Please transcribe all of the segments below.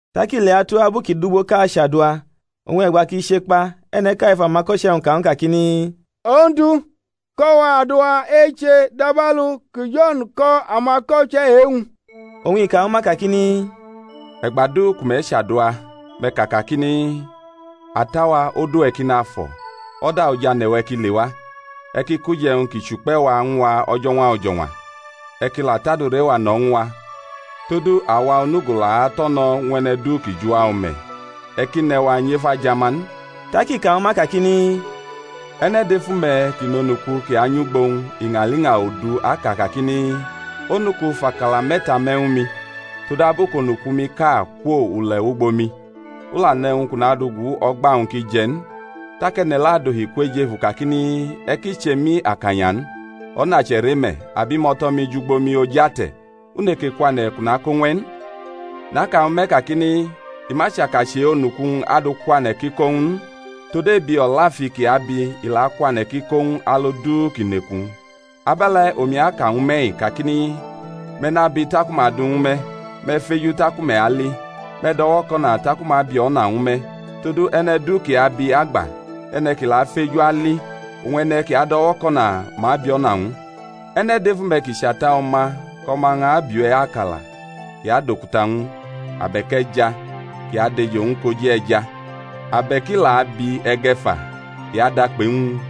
Tak i leatʼabu kʼi dʼugboʼka achadua, oñ e̩gba kʼi che kpa e̩ne̩ʼka ef amako̩che̩-wñ ka ñw u kakini, Ondu, ko̩ wa adua eche, dabalu ku Jo̩n la ko̩ amako̩che̩ e-wñ. Oñ i ka ñwu ma kakini, E̩gba du ku me̩ chadua, me̩ ka kakini: Ata-wa, odu-we̩ ki nafo̩. O̩da ojane̩-we̩ ki lewa. E̩ ki kʼuje̩wñ ki chʼukpe̩-wu ñw a o̩jo̩ñwa o̩jo̩ñwa. E̩ ki la tʼadure-wa no̩ ñw a; todu awa onugo la ato̩no̩ ñw e̩ne̩ du kʼi jʼuwa o̩me̩. E̩ ki ne̩ wa nyʼef ajama n. Tak i ka ñwu ma kakini, E̩ne̩ dʼef ume̩ kʼi nʼonuku kʼi anyʼugbo-wñ iñaliña odu aka kakini, Onuku, fʼakala me̩ta me̩ ñwu mi; todabu kʼonuku-miʼka kwo ule̩ wʼugbo mi, u la nʼe̩wñ kʼu nadʼu gu o̩gba-wñ kʼi je̩ n; tak e̩ne̩ le̩ adohi kwʼejefu kakini, E̩ ki che mi akanya n; o̩na che̩re me̩, abimo̩lo̩-mi jʼugbo mi oj ate̩; u neke kwane̩ kʼu kʼo ñw e̩ n? Naka ñwu me̩ kakini, I ma chaka chʼe-onuku-wñ adʼu kwane̩ kʼi ko ñw u n, tod ebi o̩lafi kʼi abi i la akwane̩ kʼi kʼo ñw u alu du kʼi nʼeku-wñ. Abe̩le̩ omi aka ñwu me̩-i kakini, Me̩ nabi taku ma adʼu ñwu me̩; me̩ feju taku me̩ ali; me̩ do̩wo̩ko̩na taku ma abi o̩na ñwu me̩. Todu e̩ne̩ du ki abi, agba; e̩ne̩ ki la afeju, ali; oñ e̩ne̩ ki ado̩wo̩ko̩na, ma abi o̩na ñw u. E̩ne̩ dʼef ume̩ ki chʼata o̩ma, kʼo̩ma-wñ abiʼu akala, kʼi adʼokuta ñw u? abe̩k e̩ja, kʼi adʼejo ñw u koji e̩ja? abe̩k kʼi la abi e̩ge̩ fa, i adʼakpe ñw u?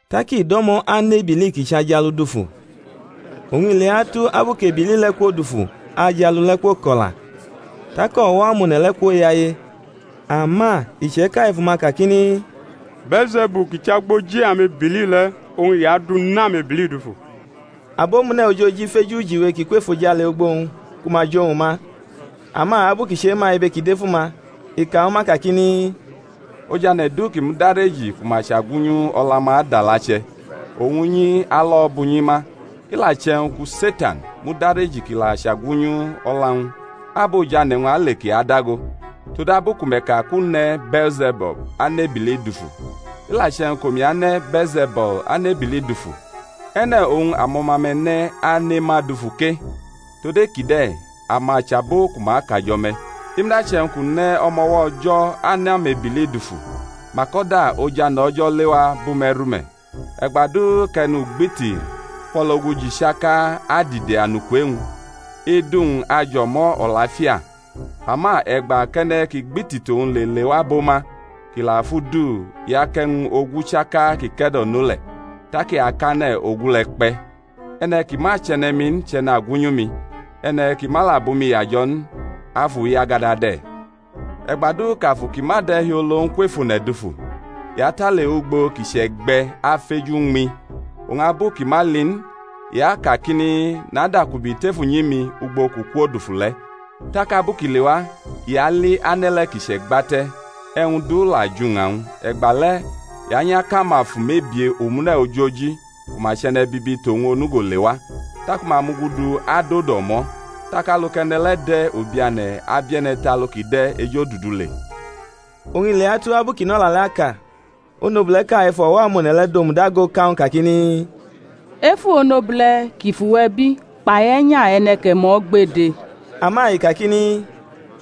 Tak i do̩mo̩ anʼebili kʼi chʼajalu dufu. Oñ i leatu abu kʼebili le̩ kwodufu ajalu le̩ kwoko̩la; tak o̩wo̩ amone̩ le̩ kwoyaye. Ama iche̩ka ef uma kakini, Bee̩lze̩bul ki chʼagboji amebili le̩ oñ i adu nʼamebili dufu. Abomune̩ ojoji feju ujiwe kʼi kwʼefojale ugbo-wñ ku ma jʼowñ ma. Ama abu kʼi chema ibe ki dʼef uma, i ka ñwu ma kakini, Ojane̩ du ki mudareji ku ma chagwunyu o̩la-ma adʼalache̩; oñ unyi alo̩ bʼunyi ma. I la che̩wñ ku Setan mudareji kʼi la chagwunyu o̩la-wñ, abʼojane̩-wñ ale kʼi adago? todabu ku me̩ ka kʼu ne̩ Bee̩lze̩bul anʼamebili dufu. I la che̩wñ kʼomi ane Bee̩lze̩bul anʼamebili dufu, e̩ne̩ oñ amo̩ma-me̩ ne̩ ane ma dufu ke? tod e-kide̩ ama chʼabo ku ma akajo̩ me̩. I muda che̩wñ kʼu ne̩ o̩mo̩wo̩ O̩jo̩ anʼamebili dufu, mak o̩da ojane̩ O̩jo̩ lewa bʼume̩ rume̩. E̩gba du kʼe̩nugbiti fʼo̩logu ji chaka adide anuku e-wñ, idu-wñ ajʼo̩mo̩ o̩lafia; ama e̩gba kʼe̩ne̩ kʼi gbiti tʼowñ le lewa bʼo ma, kʼi la fʼu du, i akʼe̩wñ ogu chaka kʼi ke̩do̩no le̩, tak i akʼane̩ ogu le̩ kpe̩. E̩ne̩ ki ma chʼe̩ne̩-mi n chʼe̩nagwunyu mi; e̩ne̩ ki ma la bʼumi yajo̩ n, afuyagada de̩. E̩gba du kʼafu ki ma de̩hiolo n kwʼef one̩ dufu, i atʼale ugbo kʼi chʼe̩gbe̩ afeju uñmi, oñ abu kʼi ma li n, i akakini, Nadakubi tef unyi-mi ugbo kʼu kwo dufu le̩. Tak abu kʼi lewa i ali ane̩ le̩ kʼi che̩gbate̩, e̩wñ du la jʼuña-wñ. E̩gbale̩ i anyʼakʼamafu mebie omune̩ ojoji ku ma chʼe̩ne̩bibi tʼowñ onugo le wa; taku ma mugudu adodo o̩mo̩; tak alu kʼe̩ne̩ le̩ de̩ ubiane̩ abie̩ne̩ tʼalu kʼi de̩ ejodudu le. Oñ i leatu abu kʼi nʼo̩la le̩ aka, onobule̩ʼka ef o̩wo̩-amone̩ le̩ domudago ka ñw u kakini, Efu onobule̩ ki fʼuwe̩ bi kpai e̩nya e̩ne̩ kʼe̩ ñmo̩ gbede! Ama i kakini,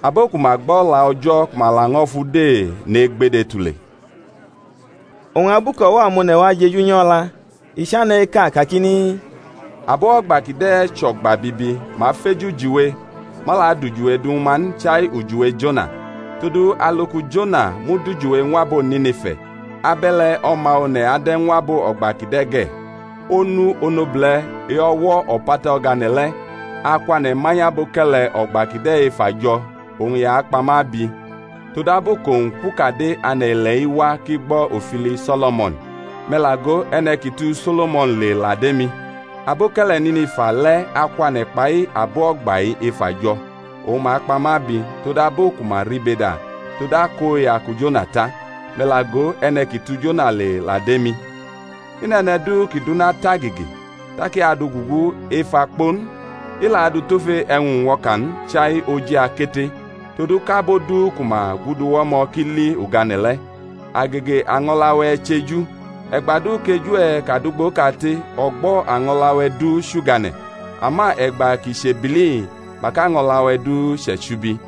Abo ku ma gbo̩ O̩la O̩jo̩ ku ma laño̩ fʼu de nʼegbede tule. Oñ abu kʼo̩wo̩ amone̩ wa jeju nyʼo o̩la, i chane̩ eka kakini, Abo o̩gba kide̩ chʼo̩gba bibi; ma feju ujiwe; ma la adʼujiwe du ñwu ma n, chai ujiwe Jona. Todu alu ku Jona mud ujiwe ñw abo Nine̩fa, abe̩le̩ O̩ma One̩ ade̩ ñw abo o̩gba kide̩ ge̩. Onu onobule̩ e-o̩wo̩ o̩pata o̩gane̩ le̩ akwane̩ manyʼaboke̩le̩ o̩gba kide̩ ef ajo̩ oñ i akpa ma abi; todabu kʼowñ kwʼukade ane̩-ile̩-i wa kʼi gbo̩ ofili So̩lo̩mo̩n; me̩ la go, e̩ne̩ ki tu So̩lo̩mo̩n le la dʼemi. Aboke̩le̩ Nine̩fa le̩ akwane̩ kpai abo o̩gba-i ef ajo̩, oñ ma akpa ma abi; todabu ku ma rʼibe da tod akoya ku Jona ta; me̩ la go, e̩ne̩ ki tu Jona le la dʼemi. I nʼe̩ne̩ du kʼi dʼuna tʼagege tak i adʼu gugu ef akpo n, i la adʼu tʼofe e̩wñ uñwo̩ka n, chai oji akete, todu kʼabo du ku ma guduwʼo̩mo̩ ki li ugane̩ le̩. Agege año̩la-we̩ chʼeju: e̩gba du kʼeju-we̩ kadʼugboʼkate, o̩gbo̩ año̩la-we̩ du chʼugane̩; ama e̩gba kʼi chʼebili, mak ano̩la-we̩ du chʼe̩chubi.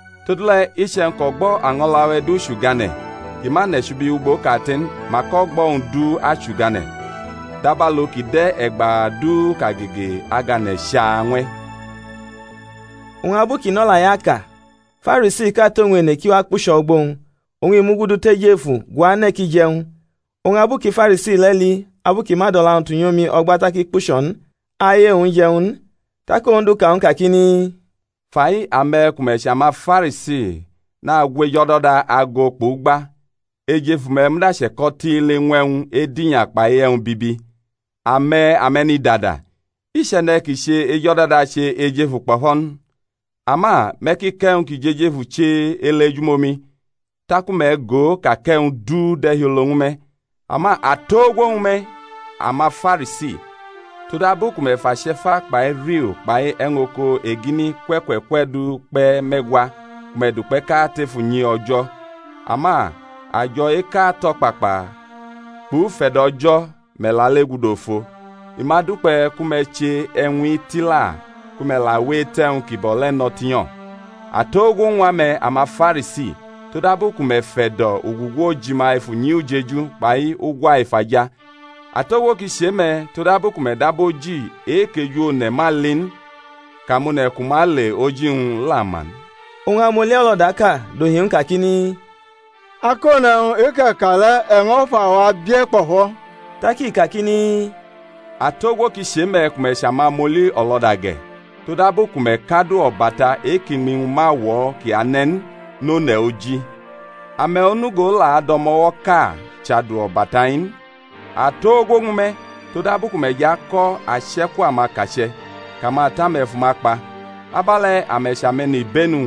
Todule̩ iche̩wñ kʼo̩gbo̩ año̩la-we̩ du chʼugane̩, kʼi ma nʼe̩chubi ugbo kate n, mak o̩gbo̩-wñ du achʼugane̩, dabalu ki de̩ e̩gba du kʼagege agane̩ chaa ñw e̩. Oñ abu kʼi nʼo̩la-i aka, Farisiʼka tʼowñ ene kʼi wa kpucho̩ ugbo-wñ: oñ i mugudu tʼejefu guane̩ kʼi jʼe̩wñ. Oñ abu ku Farisi le̩ li abu kʼi ma dʼo̩la-wñ tunyʼomi o̩gba tak i kpucho̩ n aye-wñ je̩ ñw u n. Tak Ondu ka ñw u kakini, Fai, ame̩ ku me̩ chʼamaFarisi nagwʼejo̩do̩da ago kpʼugba; ejefu-me̩ muda che̩ko̩ tiili ñw e̩wñ edinya kpai e̩wñ bibi. Ame̩ ame̩nidada! I chʼe̩ne̩ ki che ejo̩do̩da che ejefu kpo̩fo̩ n? Ama me̩ ki kʼe̩wñ ki jʼejefu che ele ejumomi, taku me̩ go ka kʼe̩wñ du de̩hiolo ñwu me̩. Ama atogwo ñwu me̩, amaFarisi! Todabu ku me̩ fʼache̩fa kpai riu kpai e̩wñ oko egini kwe̩ kwe̩ kwe̩ du kpe̩ me̩gwa ku me̩ dʼukpe̩ʼka tef unyi O̩jo̩, ama ajo̩ eka tʼo̩kpakpa, kpʼufe̩do̩ O̩jo̩, me̩ lale gudu ofo: i ma dukpe̩ ku me̩ che e̩wñ-i tila, ku me̩ la we etʼe̩wñ kibo̩ le̩ no̩ tinyo̩. Atogwo ñw ame̩, amaFarisi! todabu ku me̩ fe̩do̩ ugugu ojima ef unyi ujeju kpai ugwa efaja. Atogwo ki chʼe-me̩! todabu ku me̩ dab oji e-kʼeju one̩ ma li n kʼamone̩ ku ma le oji-wñ la ma n. Oñ amʼoli o̩lo̩daʼka dohi ñw u kakini, Akone̩wñ, e-kʼe̩ ka le̩, e̩ ño̩ fʼawa bie̩ kpo̩fo̩. Tak i kakini, Atogwo ki chʼe-me̩ ku me̩ chʼamamʼoli o̩lo̩da ge̩! todabu ku me̩ kʼadu o̩bata e-kʼiñmi-wñ ma wo̩ kʼi ane̩ n nʼone̩ oji, ame̩ onugo la adʼo̩mo̩wo̩ʼka chʼadu-o̩bata-i n. Atogwo ñwu me̩! Todabu ku me̩ jʼako̩ ache̩ku amakache̩, kʼamata-me̩ fʼuma kpa. Abe̩le̩ ame̩ chʼame̩nibenu-wñ,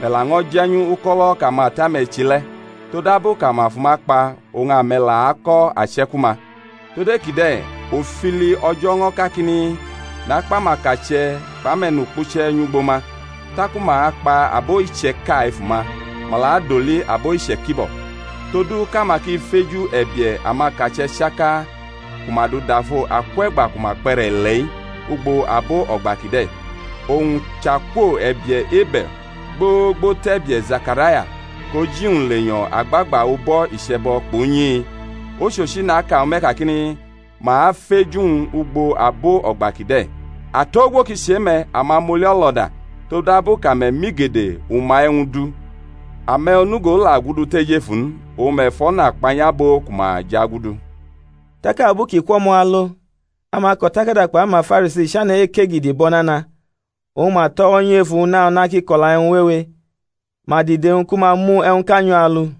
me̩ laño̩ je̩nyu uko̩lo̩ kʼamata-me̩ che le̩: todabu kʼama fʼuma kpa, oñ ame̩ la ako̩ ache̩ku-ma. Tod e-kide̩ ofili O̩jo̩ ño̩ kakini, Nakpʼamakache̩ kpʼame̩nukpuche̩ nyʼugbo ma; taku ma akpa abo iche̩ka efu-ma, ma la adoli abo iche̩kibo̩; todu kʼama ki feju e̩bie̩ amakache̩ chaka ku ma dudalʼo akwe̩gba ku ma kpʼe̩re̩ ile̩-i, ugbo abo o̩gba kide̩. Owñ chʼakwo e̩bie̩ Ebe̩l gbogbo tʼe̩bie̩ Zekaraya kʼoji-wñ lenyo̩ agbagba ubo̩ iche̩bo̩ kpʼunyi-i; ochochi, naka ñwu me̩ kakini, Ma afeju-wñ ugbo abo o̩gba kide̩. Atogwo ki chʼe-me̩, amam oli-o̩lo̩da! todabu kʼame̩ mʼigede uma-e̩wñ du: ame̩ onugo la gudu tʼejefu n, oñ me̩ fʼo̩na kpanyʼabo ku ma jʼagudu. Tak abu kʼi kwʼo̩mo̩ alo amako̩takada kpai amaFarisi chane̩ ekegidi bʼo̩ nana; oñ ma tʼo̩wo̩ nyʼu efu una una kʼi ko̩la e̩wñ wewe; ma dide-wñ ku ma mu e̩wñʼka nyʼu alu.